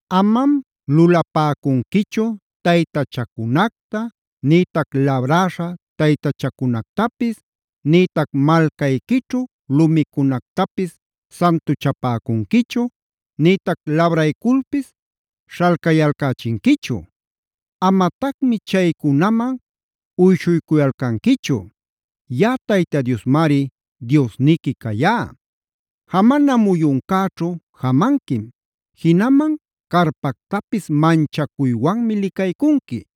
“Amam lulapäcunquichu taytachacunacta nïtac labräśha taytachacunactapis, nïtac malcayquićhu lumicunactapis santuchapäcunquichu, nïtac labrayculpis śhalcayalcächinquichu. Amatacmi chaycunaman uyshuycuyalcanquichu.a Yaꞌa Tayta Diosmari Diosniqui cayá. Jamana muyuncäćhu jamanquim; jinaman carpactapis manchacuywanmi licaycunqui.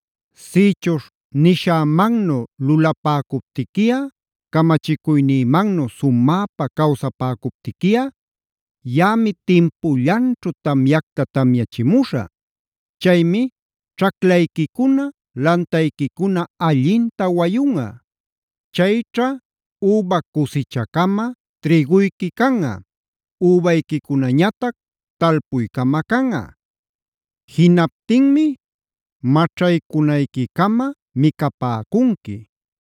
“Sïchuśh nishämannu lulapäcuptiquiꞌa, camachicuynïmannu sumäpa cawsapäcuptiquiꞌa, yaꞌami timpullanćhu tamyacta tamyachimuśhä. Chaymi ćhaclayquicuna lantayquicuna allinta wayunꞌa. Chayćha üba cusichacama trïguyqui canꞌa; übayquicunañatac talpuycama canꞌa. Jinaptinmi maćhaycunayquicama micapäcunqui,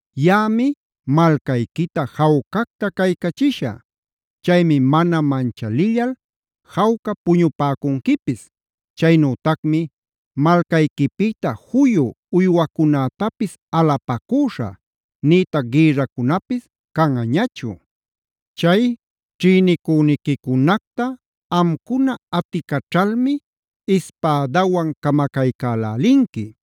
Yaꞌami malcayquita jawcacta caycachishä. Chaymi mana manchalillal jawca puñupäcunquipis. Chaynütacmi malcayquipïta juyu uywacunätapis alapacüśhä, nïtac gïrracunapis canꞌañachu. Chay ćhïnicüniquicunacta amcuna aticaćhalmi ispädawan camacaycälälinqui.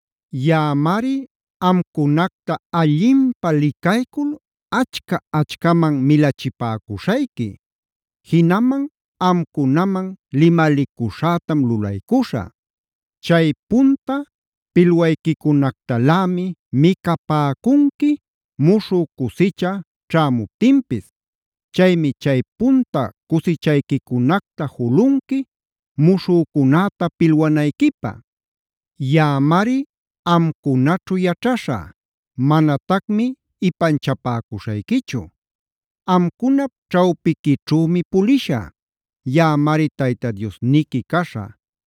Yaꞌamari amcunacta allinpä licaycul achca-achcaman milachipäcuśhayqui. Jinaman amcunaman limalicuśhätam lulaycuśhä. Chay punta pilwayquicunactalämi micapäcunqui muśhü cusicha ćhämuptinpis. Chaymi chay punta cusichayquicunacta julunqui muśhücunäta pilwanayquipä. “Yaꞌamari amcunaćhu yaćhaśhä; manatacmi ipanchapäcuśhayquichu. Amcunap ćhawpiquićhümi pulishä. Yaꞌamari Tayta Diosniqui caśhä;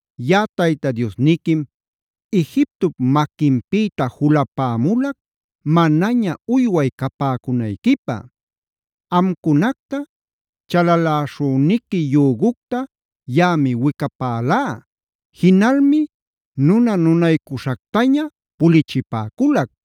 Yaꞌa Tayta Diosniquim Egiptop maquinpïta julapämulac manaña uyway capäcunayquipä. Amcunacta chalaläśhüniqui yügucta yaꞌami wicapälá; jinalmi nuna-nunaycuśhactaña pulichipäculac.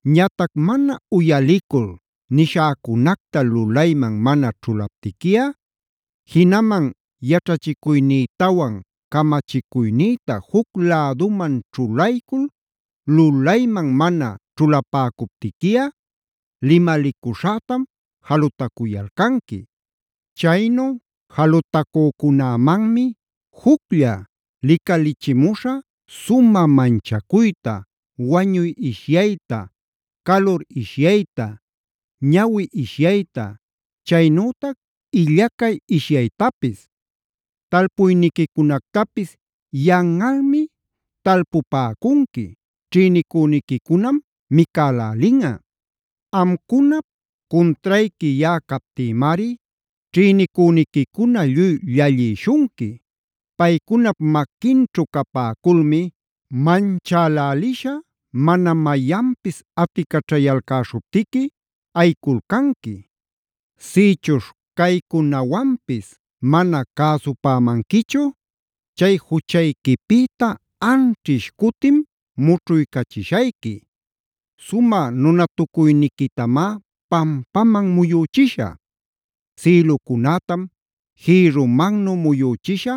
“Ñatac mana uyalicul nishäcunacta lulayman mana ćhulaptiquiꞌa, jinaman yaćhachicuynïtawan camachicuynïta juc läduman ćhulaycul lulayman mana ćhulapäcuptiquiꞌa limalicuśhätam jalutacuyalcanqui. Chaynu jalutacücunämanmi juclla licalichimuśhä: sumä manchacuyta, wañuy ishyayta, calur ishyayta, ñawi ishyayta, chaynütac illacay ishyaytapis. Talpuyniquicunactapis yanꞌalmi talpupäcunqui, ćhïnicüniquicunam micacälälinꞌa. Amcunap cuntrayqui yaꞌa captïmari ćhïnicüniquicuna lluy llallïshunqui. Paycunap maquinćhu capäculmi manchälälisha mana mayanpis aticaćhayalcäśhuptiqui ayiculcanqui. “Sïchuśh caycunawanpis mana cäsupämanquichu, chay juchayquipïta anćhish cutim mućhuycachishayqui. Sumä nunatucuyniquitamá pampaman muyüchishä; sïlucunätam jïrrumannu muyüchishä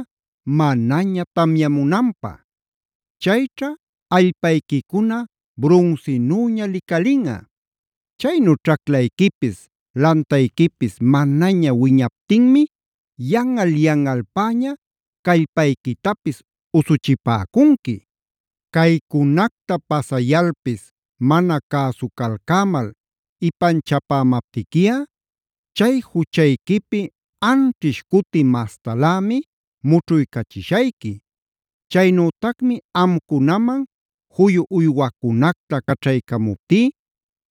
manaña tamyamunanpä. Chayćha allpayquicuna brunsinüña licalinꞌa. Chaynu ćhaclayquipis, lantayquipis manaña wiñaptinmi yanꞌal-yanꞌalpäña callpayquitapis usuchipäcunqui. “Caycunacta pasayalpis mana cäsucalcämal ipanchapämaptiquiꞌa chay juchayquipi anćhish cuti mastalämi mućhuycachishayqui. Chaynütacmi amcunaman juyu uywacunacta caćhaycamuptí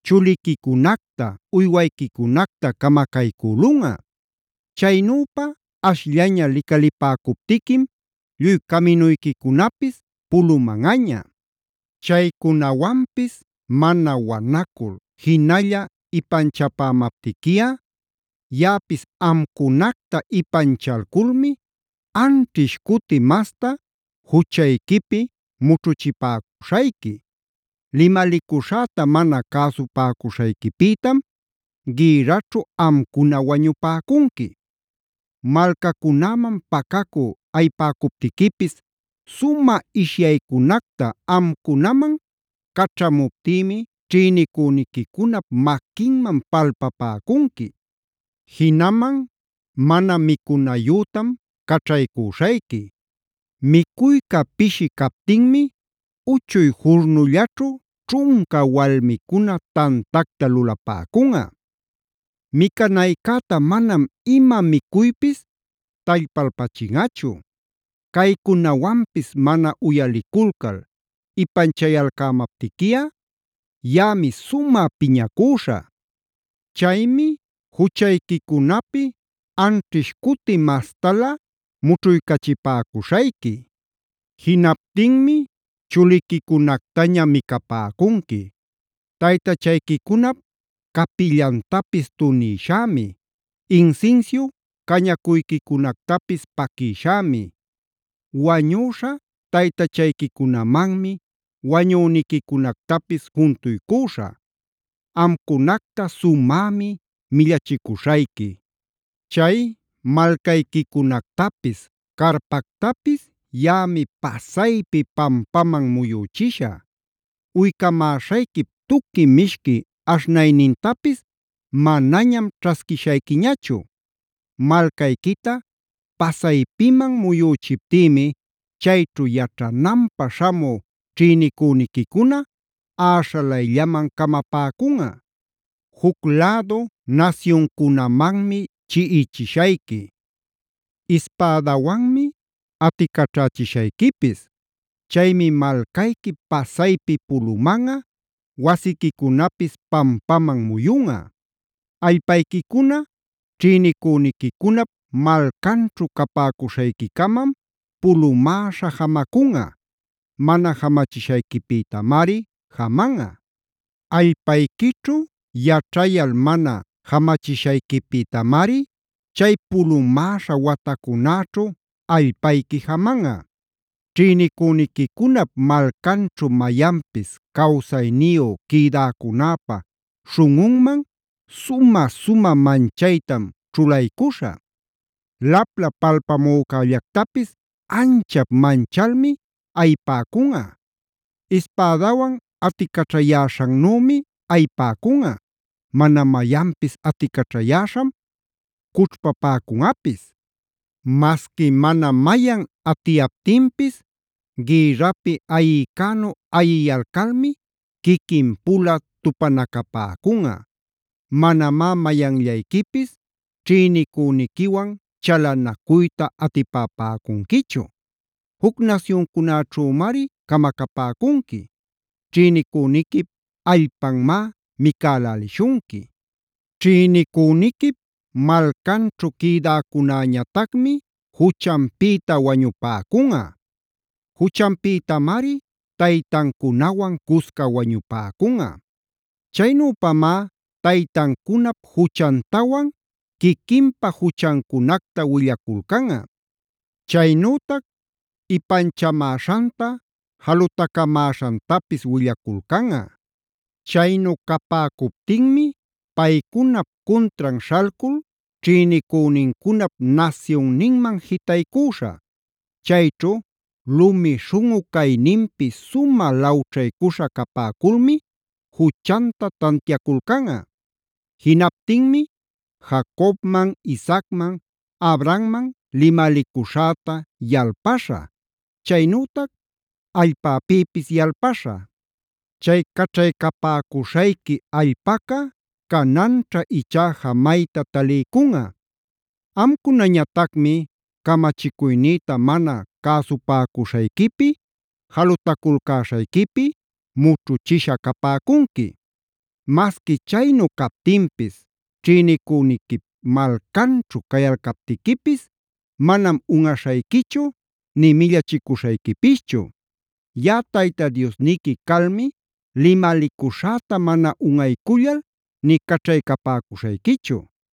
chuliquicunacta, uywayquicunacta camacaycülunꞌa. Chaynüpa ashllaña licalipäcuptiquim lluy caminuyquicunapis pulumanꞌaña. “Chaycunawanpis mana wanacul jinalla ipanchapämaptiquiꞌa, yaꞌapis amcunacta ipanchalculmi anćhish cuti masta juchayquipi mućhuchipäcuśhayqui. Limalicuśhäta mana cäsupäcuśhayquipïtam gïrraćhu amcuna wañupäcunqui. Malcacunäman pacacü ayipäcuptiquipis sumä ishyaycunacta amcunaman caćhamuptïmi ćhïnicüniquicunap maquinman palpapäcunqui. “Jinaman mana micunayütam caćhaycuśhayqui. Micuyca pishi captinmi uchuy jurnullaćhu ćhunca walmicuna tantacta lulapäcunꞌa. Micanaycäta manam ima micuypis tallpalpachinꞌachu. “Caycunawanpis mana uyaliculcal ipanchayalcämaptiquiꞌa, yaꞌami sumä piñacüśhä. Chaymi juchayquicunapi anćhish cuti mastalä mućhuycachipäcuśhayqui. Jinaptinmi chuliquicunactaña micapäcunqui. Taytachayquicunap capillantapis tunïshämi, insinsiu cañacuyquicunactapis paquïshämi, wañüśha taytachayquicunamanmi wañüniquicunactapis juntuycüśhä. Amcunacta sumämi millachicuśhayqui. Chay malcayquicunactapis, carpactapis yaꞌami pasaypi pampaman muyüchishä. Uycamäśhayquip tuqui mishqui aśhnaynintapis manañam ćhasquishayquiñachu. “Malcayquita pasaypiman muyüchiptïmi chayćhu yaćhananpä śhamü ćhïnicüniquicuna äśhalayllaman camapäcunꞌa. Juc lädu nasyuncunamanmi chiꞌichishayqui. Ispädawanmi aticaćhächishayquipis. Chaymi malcayqui pasaypi pulumanꞌa, wasiquicunapis pampaman muyunꞌa. Allpayquicuna ćhïnicuniquicunap malcanćhu capäcuśhayquicamam pulumäśha jamacunꞌa; mana jamachishayquipïtamari jamanꞌa. Allpayquićhu yaćhayal mana jamachishayquipïtamari chay pulumäśha watacunäćhu allpayqui jamanꞌa. “Ćhïnicüniquicunap malcanćhu mayanpis cawsayniyu quïdacunäpä śhunꞌunman sumä-sumä manchaytam ćhulaycuśhä: lapla palpamücällactapis anchap manchalmi ayipäcunꞌa; ispädawan aticaćhayäśhannümi ayipäcunꞌa, mana mayanpis aticaćhayäśham cućhpapäcunꞌapis. Masqui mana mayan atiyaptinpis gïrrapi ayïcänu ayiyalcalmi quiquin-pula tupanacapäcunꞌa. Manamá mayanllayquipis ćhïnicüniquiwan chalanacuyta atipapäcunquichu. Juc nasyuncunaćhümari camacapäcunqui. Ćhïnicüniquip allpanmá micälälishunqui. Ćhïnicüniquip malcanćhu quïdäcunäñatacmi juchanpïta wañupäcunꞌa; juchanpïtamari taytancunawan cusca wañupäcunꞌa. “Chaynüpamá taytancunap juchantawan quiquinpa juchancunacta willaculcanꞌa. Chaynütac ipanchamäśhanta jalutacamäśhantapis willaculcanꞌa. Chaynu capäcuptinmi paycunap cuntran śhalcul ćhïnicünincunap nasyunninman jitaycüśhä. Chayćhu lumi śhunꞌu cayninpi sumä lawćhaycuśha capäculmi juchanta tantiaculcanꞌa. Jinaptinmi Jacobman,e Isaacman,f Abrahammang limalicuśhäta yalpaśhä, chaynütac allpäpïpis yalpaśhä. Chay caćhaycapäcuśhayqui allpaca cananćha ichá jamayta taliycunꞌa. Amcunañatacmi camachicuynïta mana cäsupäcuśhayquipi, jalutaculcäśhayquipi mućhuchisha capäcunqui. “Masqui chaynu captinpis ćhïnicüniquip malcanćhu cayalcaptiquipis manam unꞌaśhayquichu, nï millachicuśhayquipischu. Yaꞌa Tayta Diosniqui calmi limalicuśhäta mana unꞌaycullal nï caćhaycapäcuśhayquichu.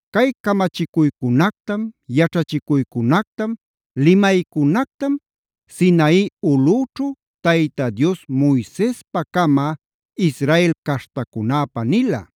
Cay camachicuycunactam, yaćhachicuycunactam, limaycunactam Sinai ulꞌüćhu Tayta Dios Moisespacama Israel caśhtacunäpä nila.